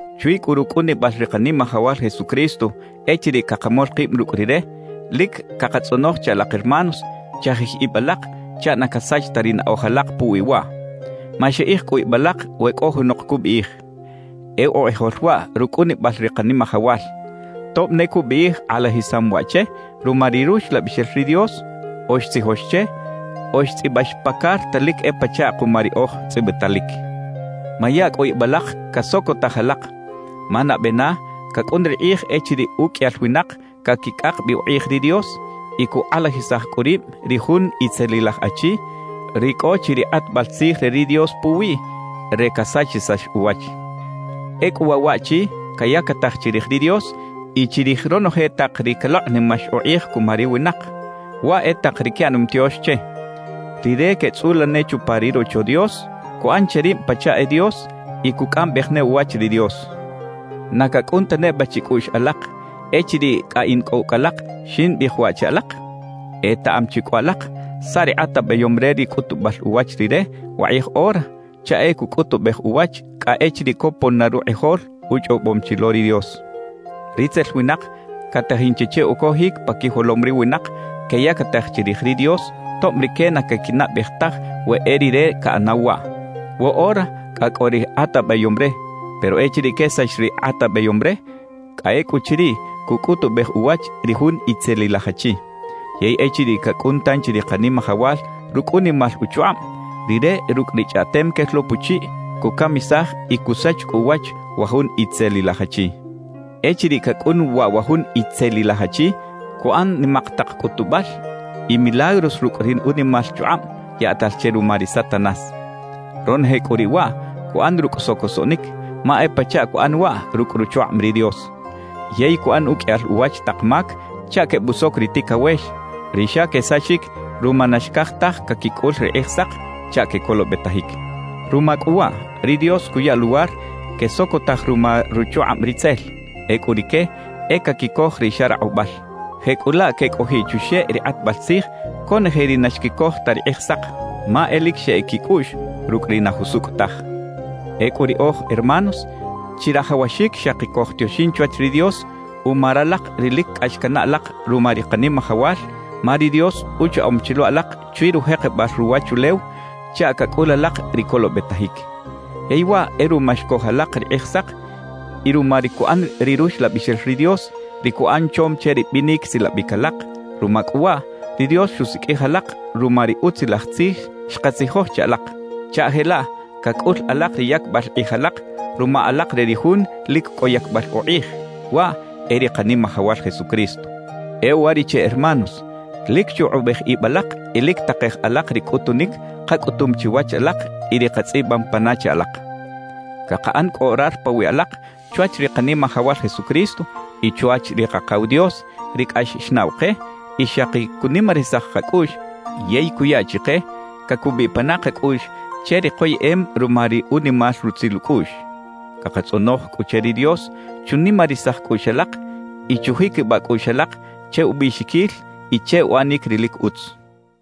Chwi cꞌu rucꞌunibal ri Kanimajawal Jesucristo echiriꞌ cakamol kib rucꞌ Rire, lic cakatzꞌonoj che alak hermanos, chajij ib alak chaꞌ na casach ta ri naꞌoj alak puwi waꞌ. Maxiꞌij cꞌu ib alak we cꞌo junok cubiꞌij: «E ukꞌijol waꞌ rucꞌunibal ri Kanimajawal,» tob ne cubiꞌij kꞌalajisam waꞌ che ruma ri Ruxlabixel ri Dios o xtzijox che o xtzꞌibax pa carta lic e pachaꞌ kuma riꞌoj tzꞌibitalic. Maya cꞌu ib alak casocotaj alak, ma nabe na cacꞌun ri kꞌij echiriꞌ uqꞌuiyal winak caquicꞌak bi ukꞌij ri Dios y cukꞌalajisaj cꞌu rib ri jun itzelilaj achi, ri cꞌo chi ri kꞌatbal tzij re ri Dios puwiꞌ re casachisax uwach. Ecꞌu waꞌ waꞌchi cayactaj chirij ri Dios y chirij ronoje tak ri calokꞌnimax ukꞌij cuma ri winak, waꞌ e tak ri quiꞌanom tiox che. Rire queꞌtzꞌula ne chupa ri Rocho Dios, cuꞌan che rib pachaꞌ e Dios y cucꞌambej ne uwach ri Dios. ¿Na cacꞌun ta neba chicꞌuꞌx alak, echiriꞌ cꞌa in cꞌo ucꞌ alak, ximbiꞌij waꞌ che alak? Etaꞌam chi cꞌu alak saꞌ ri kꞌatabeyom re ri cꞌutubal uwach rire wakꞌij ora chaꞌ e cucꞌutubej uwach cꞌa echiriꞌ copon na rukꞌijol uchꞌobom chi lo ri Dios. Ritzel winak catajin chi che ucojic pa quijolom ri winak queyactaj chirij ri Dios tob rique na caquinaꞌbej taj we e rire caꞌanaw waꞌ. Woꞌora cꞌa cꞌo ri kꞌatabeyom re, pero echiriꞌ quesax ri kꞌatabeyom re, cꞌa ecꞌuchiriꞌ cucꞌutubej uwach ri jun itzelilaj achi. Yey echiriꞌ cacꞌun tanchi ri Kanimajawal rucꞌ unimal uchukꞌab, Rire rucꞌ ri chꞌaꞌtem quel lo puchiꞌ cucamisaj y cusach cꞌu uwach wa jun itzelilaj achi. Echiriꞌ cacꞌun waꞌ wa jun itzelilaj achi, cuꞌan nimak tak cꞌutubal y milagros rucꞌ ri unimal chukꞌab yaꞌtal che ruma ri Satanás. Ronoje cꞌu riꞌ waꞌ, cuꞌan rucꞌ socosoꞌnic, ma e pachaꞌ cuꞌan waꞌ rucꞌ ruchukꞌab ri Dios. Yey cuꞌan uqꞌuiyal uwach tak mac chaꞌ quebusoc ri ticawex, ri xa quesachic ruma na xcaj taj caquicꞌul ri Kꞌijsak chaꞌ quecolobetajic. Ruma cꞌu waꞌ, ri Dios cuya luwar quesocotaj ruma ruchukꞌab ritzel; ecꞌu rique e caquicoj ri xa rakꞌubal. Jecꞌulaꞌ quecꞌojiꞌ chuxeꞌ ri kꞌatbal tzij conoje ri na xquicoj ta ri Kꞌijsak, ma e lic xeꞌec quicꞌuꞌx rucꞌ ri na jusucꞌ taj. Ecꞌu riꞌoj, hermanos, chirajawaxic xaki cojtioxin chwach ri Dios uma ralak ri lic cꞌax canaꞌ alak ruma ri Kanimajawal, ma ri Dios uchaꞌom chi lo alak chwi rujekebal ruwachulew chaꞌ cacꞌul alak ri colobetajic. Yey waꞌ e ruma xcoj alak ri Kꞌijsak y ruma ri cuꞌan ri Ruxlabixel ri Dios, ri cuꞌan chom che ri binic silabic alak. Ruma cꞌu waꞌ, ri Dios xusiqꞌuij alak ruma ri Utzilaj Tzij xkatzijoj che alak, chaꞌ jelaꞌ cacꞌul alak ri yacbal kꞌij alak ruma alak re ri Jun lic cꞌo yacbal ukꞌij, waꞌ e ri Kanimajawal Jesucristo. E uwariꞌche hermanos, lic chukꞌubej ib alak y lic takej alak ri cꞌutunic kacꞌutum chiwach alak y ri katzꞌibam pana che alak. Cakaꞌan cꞌu orar pawiꞌ alak chwach ri Kanimajawal Jesucristo y chwach ri Kakaw Dios, ri cꞌax xnaꞌw ke y xaki cunimarisaj kacꞌuꞌx yey cuya chike cacubiꞌ pana kacꞌuꞌx che ri koyeꞌem ruma ri unimal rutzil ucꞌuꞌx. Cakatzꞌonoj cꞌu che ri Dios chunimarisaj cꞌuꞌx alak y chujiquibaꞌ cꞌuꞌx alak che ubiꞌxiquil y che uꞌanic ri lic utz.